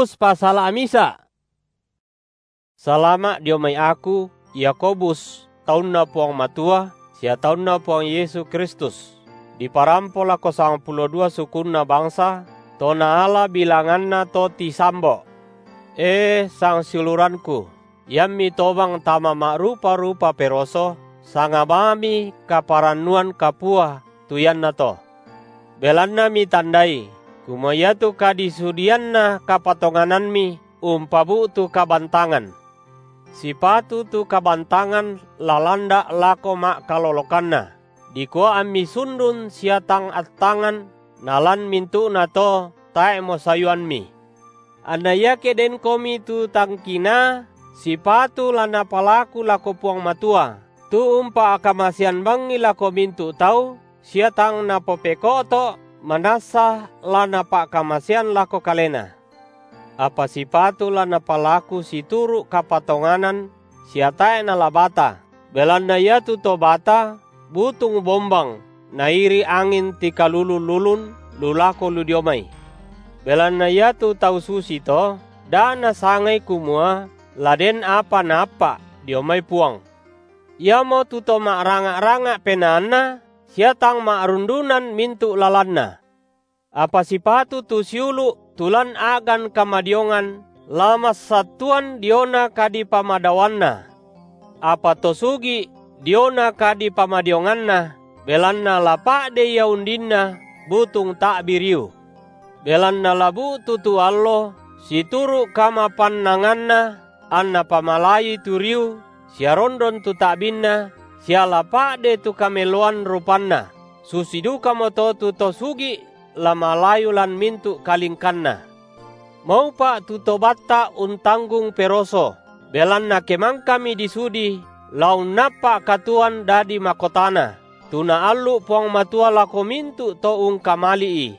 Passalama’ Salama’ dio mai aku, Yakobus, taunNa Puang Matua sia taunNa Puang Yesu Kristus, diparampo lako sangpulo dua sukunna bangsa to naala bilanganna to tisambo’. E sangsiulurangku, iammi tobang tama ma’rupa-rupa peroso, sanga bangmi kaparannuan kapua tu iannato; belanna mitandai, kumua iatu kadisudianna kapatonganammi umpabu’tu kabantangan. Sipatu tu kabantangan la landa’ lako ma’kalolokanna, dikua ammi sundun sia tang attangan, nalan mintu’nato tae’mo sayuammi. Anna iake denkomi tu tang kinaa, sipatu la napalaku lako Puang Matua, tu umpa’kamasean bangi lako mintu’ tau sia tang Napopeko’to’, manassa la Napa’kamasean lako kalena. Apa sipatu la napalaku situru’ kapatonganan sia tae’ nala bata, belanna iatu to bata butung bombang, nairi’ angin tikalulun-lulun lu lako lu dio mai. Belanna iatu tau susito da nasangai, kumua la den apa naappa’ dio mai Puang; iamotu to ma’ranga’-ranga’ penaanna, sia tang ma’rundunan mintu’ lalanna. Apa sipatu tu siulu’ tu lan a’gan kamadiongan la massattuan diona kadipamadaoanna; apa to sugi’ diona kadipamadionganna, belanna la pa’de ia undinna butung ta’bi riu. Belanna la bu’tu tu allo situru’ kamapannanganna anna pamalayui tu riu sia rondon tu ta’binna sia la pa’de tu kameloan rupanna, susi dukamoto tu to sugi’ la malayu lan mintu’ kalingkanna. Maupa’ tu to batta’ untanggung peroso, belanna ke mangkami disudi, la unnappa’ katuoan dadi makotana, tu Naallu’ Puang Matua lako mintu’ to ungkamali’I.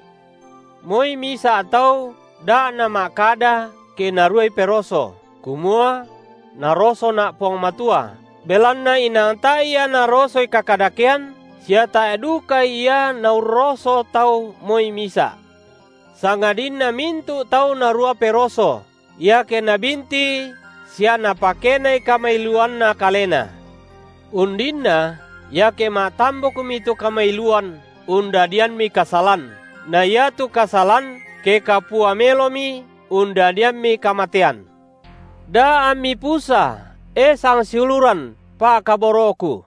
Moi misa’ tau da nama’kada, ke naruai peroso, kumua: Narosona’ Puang Matua, belanna inang tae’ Ia narosoi kakadakean, sia tae’ duka Ia Naurroso tau moi misa’; sangadinna mintu’ tau narua peroso, iake nabintii sia napakenai kamailuanna kalena. Undinna, iake ma’tambukmi tu kamailuan, undadiammi kasalan, na iatu kasalan, ke kapua melomi, undadiammi kamatean. Da ammi pusa, e sangsiuluran pa’kaboro’ku.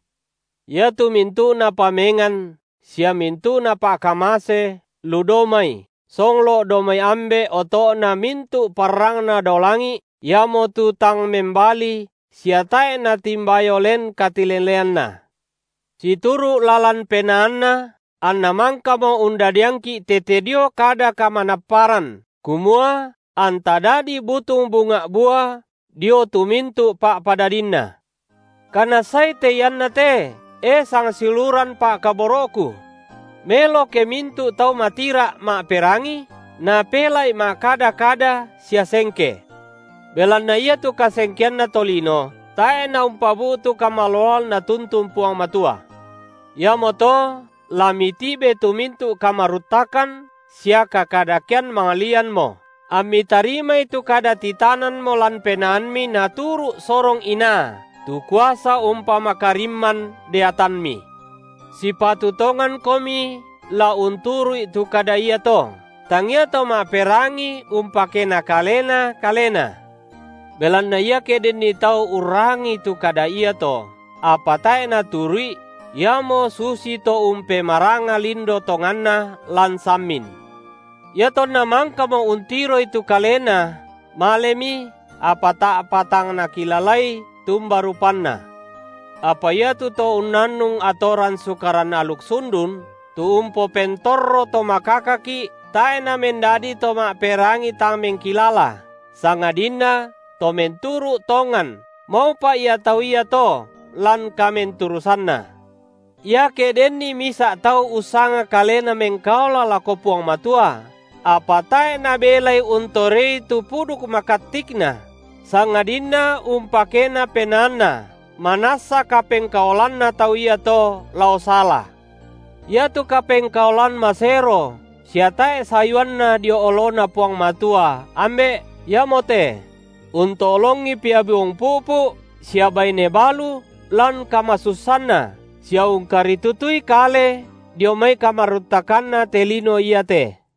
Iatu mintu’na pamengan sia mintu’na pa’kamase lu dao mai, songlo’ dao mai Ambe’, oto’na mintu’ parrangna dao langi’, Iamotu tang membali sia tae’ natimbayo len katileleanNa. Situru’ lalan penaanNa anNa mangkamo undadiangki’ tete dio kada kamanapparan kumua anta dadi butung bunga’ bua dio tu mintu’ pa’padadinNa. Kanassai te iannate, e sangsiuluran pa’kaboro’ku. Melo ke mintu’ tau matira’ ma’perangi, napela’i ma’kada-kada sia sengke. Belanna iatu kasengkeanna tolino tae’ naumpabu’tu kamaloloan Natuntun Puang Matua. Iamoto la mitibe tu mintu’ kamaruttakan sia kakadakean manglianmo, ammi tarimai tu kada titananmo lan penaammi naturu’ sorong inaa, tu kuasa umpamakarimman deatammi. Sipatu tongankomi la unturu’i tu kada iato, tangia to ma’perangi umpakena kalena kalena. Belanna iake denni tau urrangii tu kada iato, apa tae’ naturu’i, iamo susito umpemaranga lindo tonganna lan sammin. Iatonna mangkamo untiroi tu kalena, malemi, apa ta’pa tang nakilalai tumba rupanna. Apa iatu to unnannung atoran Sukaran aluk sundun, tu umpopentorro to makakaki’, tae’ namendadi to ma’perangi tang mengkilala, sangadinna to menturu’ tongan, maupa’ ia tau iato lan kamenturusanna. Iake denni misa’ tau ussanga kalena mengkaola lako Puang Matua, apa tae’ nabelai untorei tu puduk makattikna, sangadinna umpakena penaanna, manassa kapengkaolanna tau iato lao sala. Iatu kapengkaolan masero sia tae’ sayuanna dio oloNa Puang Matua, Ambe’, iamote: unto’longi pia biung pu’pu’ sia baine balu lan kamasussanna, sia ungkaritutui kale dio mai kamaruttakanna te lino iate.